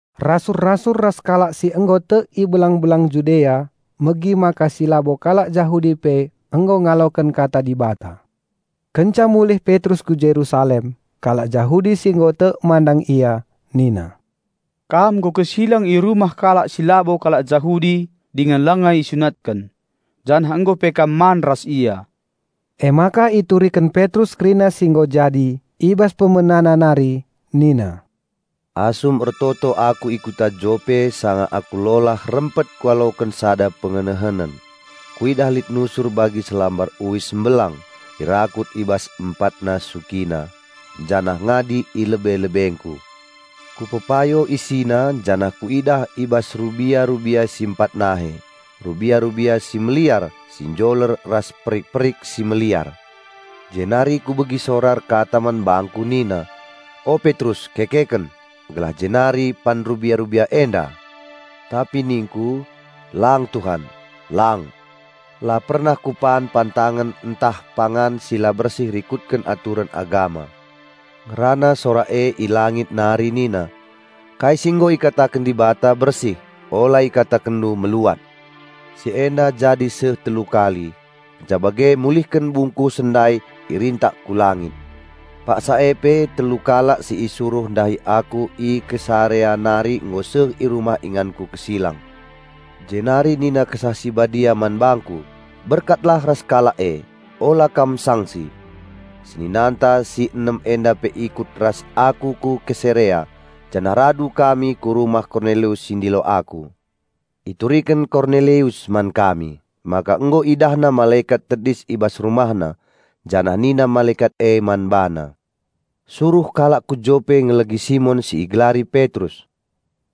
Rasul-rasul ras kalak si nggo tek i belang-belang Judea megi maka si labo kalak Jahudi pe nggo ngaloken Kata Dibata. Kenca mulih Petrus ku Jerusalem, kalak Jahudi si nggo tek mandang ia nina, "Kam nggo kesilang i rumah kalak si labo kalak Jahudi dingen langa isunatken, janah nggo pe kam man ras ia." Emaka ituriken Petrus kerina si nggo jadi, i bas pemenana nari nina, "Asum ertoto aku i kuta Jope sanga aku lolah rempet kualoken sada pengenehenen. Kuidah lit nusur bagi selambar uis mbelang, irakut i bas empatna sukina, janah ngadi i lebe-lebengku. Kupepayo isina janah kuidah i bas rubia-rubia si empat nahe, rubia-rubia si meliar, si njoler ras perik-perik si meliar. Jenari kubegi sora erkata man bangku nina, 'O Petrus kekeken, geleh jenari pan rubia-rubia enda!' Tapi ningku, 'Lang Tuhan, lang. La pernah kupan pantangen ntah pangan si la bersih rikutken aturen agama.' Ngerana sora e i langit nari nina, 'Kai si nggo ikataken Dibata bersih, ula ikatakenndu meluat!' Si enda jadi seh telu kali, kenca bage mulihken bungkusen ndai irintak ku langit. Paksa e pe telu kalak si isuruh ndahi aku i Kesarea nari nggo seh i rumah inganku kesilang. Jenari nina Kesah Si Badia man bangku, 'Berkatlah ras kalak e. Ula kam sangsi!' Seninanta si enem enda pe ikut ras aku ku Kesarea, janah rada kami ku rumah Kornelius si ndilo aku. Ituriken Kornelius man kami, maka nggo idahna malekat tedis i bas rumahna, janah nina malekat e man bana, 'Suruh kalak ku Jope ngelegi Simon si igelari Petrus.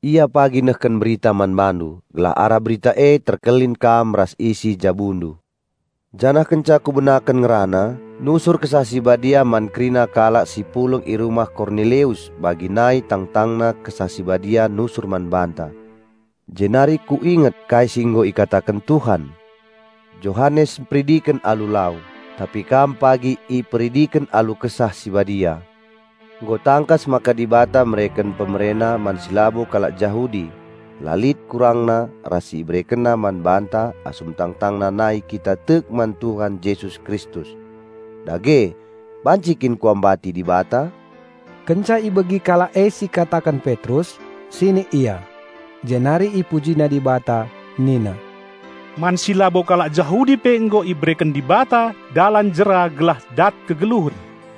Ia pagi nehken Berita man bandu, gelah arah Berita e terkelin kam ras isi jabundu.' Janah kenca kubenaken ngerana, nusur Kesah Si Badia man kerina kalak si pulung i rumah Kornelius bagi nai tangtangna Kesah Si Badia nusur man banta. Jenari kuinget kai si nggo ikataken Tuhan, 'Johanes mperidiken alu lau, tapi kam pagi iperidiken alu Kesah Si Badia.' Nggo tangkas maka Dibata mereken PemereNa man si labo kalak Jahudi la lit kurangna ras si IberekenNa man banta asum tangtangna nai kita tek man Tuhan Jesus Kristus. Dage, banci kin kuambati Dibata?" Kenca ibegi kalak e siikataken Petrus, sinik ia. Jenari ipujina Dibata nina, "Man si labo kalak Jahudi pe nggo ibereken Dibata dalan jera gelah dat kegeluhen."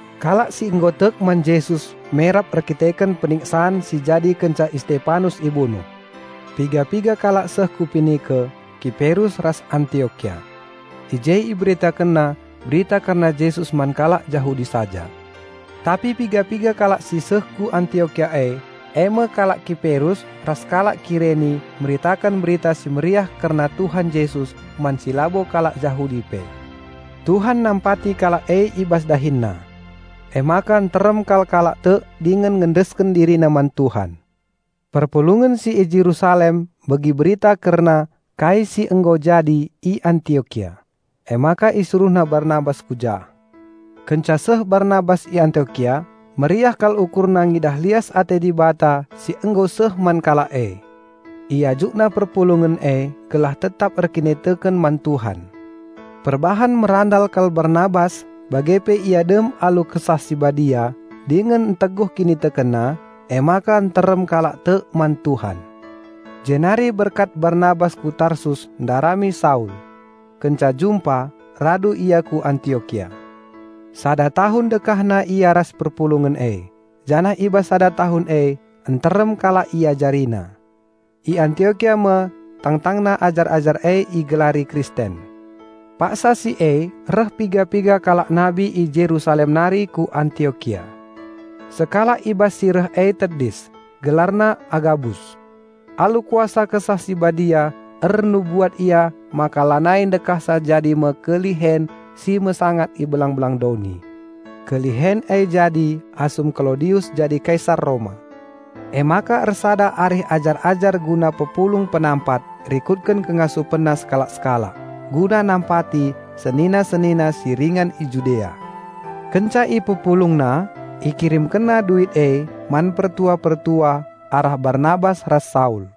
Kalak si nggo tek man Jesus merap erkiteken peniksan si jadi kenca Istepanus ibunuh. Piga-piga kalak seh ku Penike, Kiperus ras Antiokia. I je iberitakenna Berita kerna Jesus man kalak Jahudi saja. Tapi piga-piga kalak si seh ku Antiokia e, eme kalak Kiperus ras kalak Kireni meritaken Berita Si Mehuli kerna Tuhan Jesus man si labo kalak Jahudi pe. Tuhan nampati kalak e i bas dahinna. Emaka nterem kal kalak tek dingen ngendesken dirina man Tuhan. Perpulungen si i Jerusalem megi berita kerna kai si nggo jadi i Antiokia, emaka isuruhna Barnabas ku jah. Kenca seh Barnabas i Antiokia, meriah kal ukurna ngidah lias ate Dibata si nggo seh man kalak e. Iajukna perpulungen e gelah tetap erkiniteken man Tuhan. Perbahan merandal kal Barnabas bage pe ia dem alu Kesah Si Badia dingen nteguh kinitekenna, emaka nterem kalak tek man Tuhan. Jenari berkat Barnabas ku Tarsus ndarami Saul. Kenca jumpa, rada ia ku Antiokia. Sada tahun dekahna ia ras perpulungen e, janah i bas sada tahun e nterem kalak iajarina. I Antiokia me tangtangna ajar-ajar e igelari Kristen. Paksa si e reh piga-piga kalak nabi i Jerusalem nari ku Antiokia. Sekalak i bas si reh e tedis, gelarna Agabus. Alu kuasa Kesah Si Badia ernubuat ia maka lanai ndekahsa jadi me kelihen si mesangat i belang-belang doni. (Kelihen e jadi asum Klaudius jadi Kaisar Roma.) Emaka ersada arih ajar-ajar guna mpepulung penampat rikut ngasup e sekalak-sekalak guna nampati senina-senina si ringan i Judea. Kenca ipepulungna, ikirimkenna duit e man pertua-pertua arah Barnabas ras Saul.